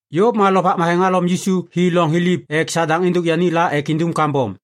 Yôv ma Lovak Matheŋ halom Yisu hi loŋ thiliv ek Sadaŋ êndôk yani la ek indum kambom.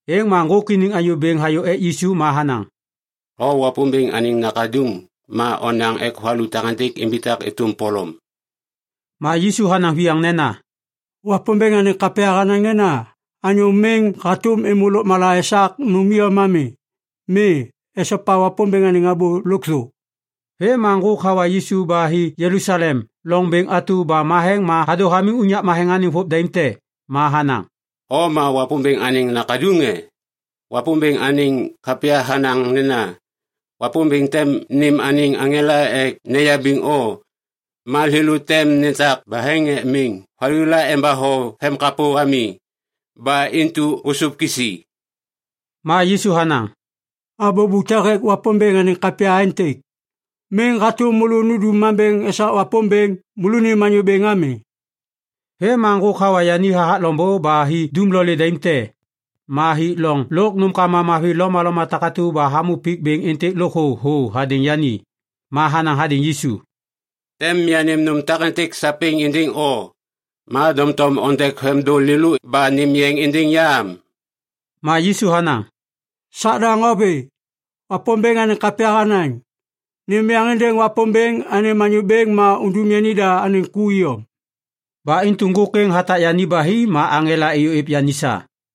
Êŋ ma ŋgôk iniŋ anyô bêŋ hayô ek Yisu ma hanaŋ, “O Wapômbêŋ anêŋ Nakaduŋ ma onaŋ ek valu takêntêk imbitak êtôm polom.” Ma Yisu hanaŋ viyaŋ nena, “Wapômbêŋ anêŋ kapya hanaŋ nena, ‘Anyô miŋ hatôm êmô lôkmala esak nôm iyom ami. Mi. Esopa Wapômbêŋ anêŋ abô lôkthô.’” Vêm ma ŋgôk hawa Yisu ba hi Jelusalem loŋ bêŋ atu ba matheŋ ma hadô hamiŋ unyak matheŋ anêŋ vôv daim te. Ma hanaŋ, “O ma Wapômbêŋ anêŋ Nakaduŋ, e? Wapômbêŋ anêŋ kapya hanaŋ nena, “‘Wapômbêŋ tem nêm anêŋ aŋela ek neyabiŋ o. Ma thêlô tem netak baheŋ ek miŋ valu la embatho vemkapô ami.’ Ba intu ôsôv kisi.” Ma Yisu hanaŋ, “Abô bute hêk Wapômbêŋ anêŋ kapya aêntêk, ‘Miŋ hatôm môlô nundum mambêŋ esak Wapômbêŋ, môlônim Anyô Bêŋ ami.’” Vêm ma ŋgôk hawa yani hathak loŋbô ba hi dumlolê daim te. Ma hik loŋ lôk nômkama mavi lomaloma takatu ba hamô pik bêŋ êntêk lôkthô thô hadêŋ yani. Ma hanaŋ hadêŋ Yisu, “Tem yanêm nôm takêntêk sapêŋ êndêŋ o. Ma doŋtom ondek vemdôŋ lêlô ba nêm yeŋ êndêŋ ya am.” Ma Yisu hanaŋ, “Sadaŋ, o vê. Wapômbêŋ anêŋ kapya hanaŋ, ‘Nêm yeŋ êndêŋ Wapômbêŋ anêm Anyô Bêŋ ma undum yanida anêŋ ku iyom.’” Ba intu ŋgôk êŋ hatak yani ba hi ma aŋela êyô êv yani sa.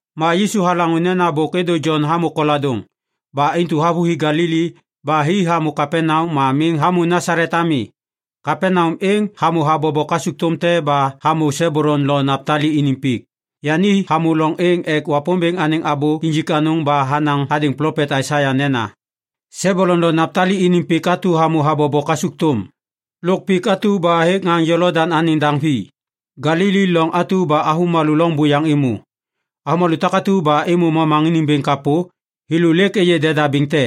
Ma Yisu halaŋô nena bôk êdô Jon hamô koladôŋ. Ba intu havôhi Galili ba hi hamô Kapaneam ma miŋ hamô Nasalet ami. Kapaneam êŋ hamô habobo kasukthôm te ba hamô Sebulun lo Naptali iniŋ pik. Yani hamô loŋ êŋ ek Wapômbêŋ anêŋ abô injik anôŋ ba hanaŋ hadêŋ plopet Aisaia nena, “Sebulun lo Naptali iniŋ pik atu hamô habobo kasukthôm, lôk pik atu ba hêk ŋaŋ Jolodaŋ anêŋ daŋ vi, Galili, loŋ atu ba avômalô loŋ buyaŋ êmô. Avômalô takatu ba êmô momaŋiniŋ bêŋ kapô, thêlô lêk êyê deda bêŋ te.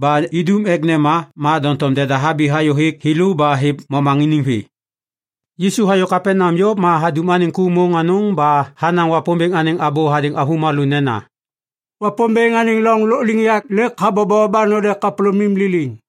Ba idum ek nema, ma doŋtom deda habi hayô hêk thêlô ba hêv momaŋiniŋ vê.” Yisu hayô Kapaneam yôv ma hadum anêŋ ku môŋ ba hanaŋ Wapômbêŋ anêŋ abô hadêŋ avômalô nena, “Wapômbêŋ anêŋ loŋ lôkliŋyak lêk habobo ba node kapôlômim liliŋ.”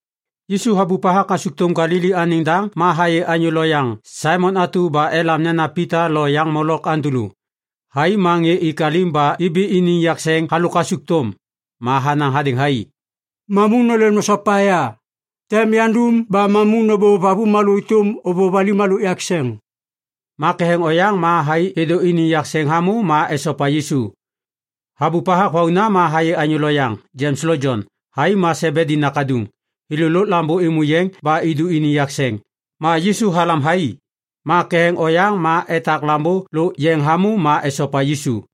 Yisu habup hathak kasukthôm Galili anêŋ liŋdaŋ ma hayê anyô lo yaŋ Saimon atu ba elam nena Pita lôk yaŋ molok Andulu. Thai ma ŋê ik alim ba ibi iniŋ yakseŋ halôk kasukthôm. Ma hanaŋ hadêŋ thai, “Mamu nôlêm nosopa ya! Tem yandum ba mamu nôbôv avômalô êtôm ôvôv alim halôk yakseŋ.” Ma ketheŋ oyaŋ ma thai êdô iniŋ yakseŋ hamô ma esopa Yisu. Habup hathak vauna ma hayê anyô loyaŋ, Jems lo Jon. Thai ma Sebedi nakaduŋ. Thêlô lôk lambô êmô yeŋ ba idu iniŋ yakseŋ. Ma Yisu halam thai. Ma ketheŋ oyaŋ ma etak lambô lôk yeŋ hamô ma esopa Yisu.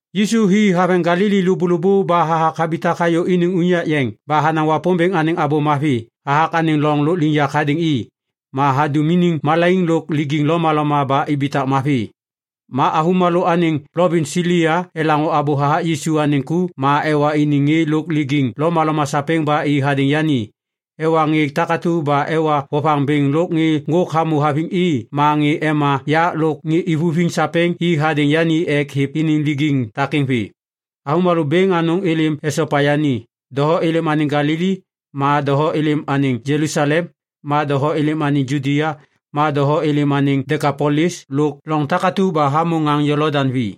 Yisu hi haveŋ Galili lôbôlôbô ba hathak habitak hayô iniŋ unyak yeŋ ba hanaŋ Wapômbêŋ anêŋ Abô Mavi hathak anêŋ loŋ lôkliŋyak hadêŋ i. Ma hadum iniŋ malaiŋ lôk lijiŋ lomaloma ba ibitak mavi. Ma avômalô anêŋ plovins Silia elaŋô abô hathak Yisu anêŋ ku ma ewa iniŋ ŋê lôk lijiŋ lomaloma sapêŋ ba i hadêŋ yani. Ewa ŋê takatu ba ewa vovaŋ bêŋ lôk ŋê ŋgôk hamô haviŋ i ma ŋê ema yak lôk ŋê ivuviŋ sapêŋ i hadêŋ yani ek hêv iniŋ lijiŋ takêŋ vê. Avômalô bêŋ anôŋ êlêm esopa yani. Doho êlêm anêŋ Galili, ma doho êlêm anêŋ Jelusalem, ma doho êlêm anêŋ Judia. Ma doho êlêm anêŋ Dekapolis lôk loŋ takatu ba hamô ŋaŋ Jolodaŋ vi.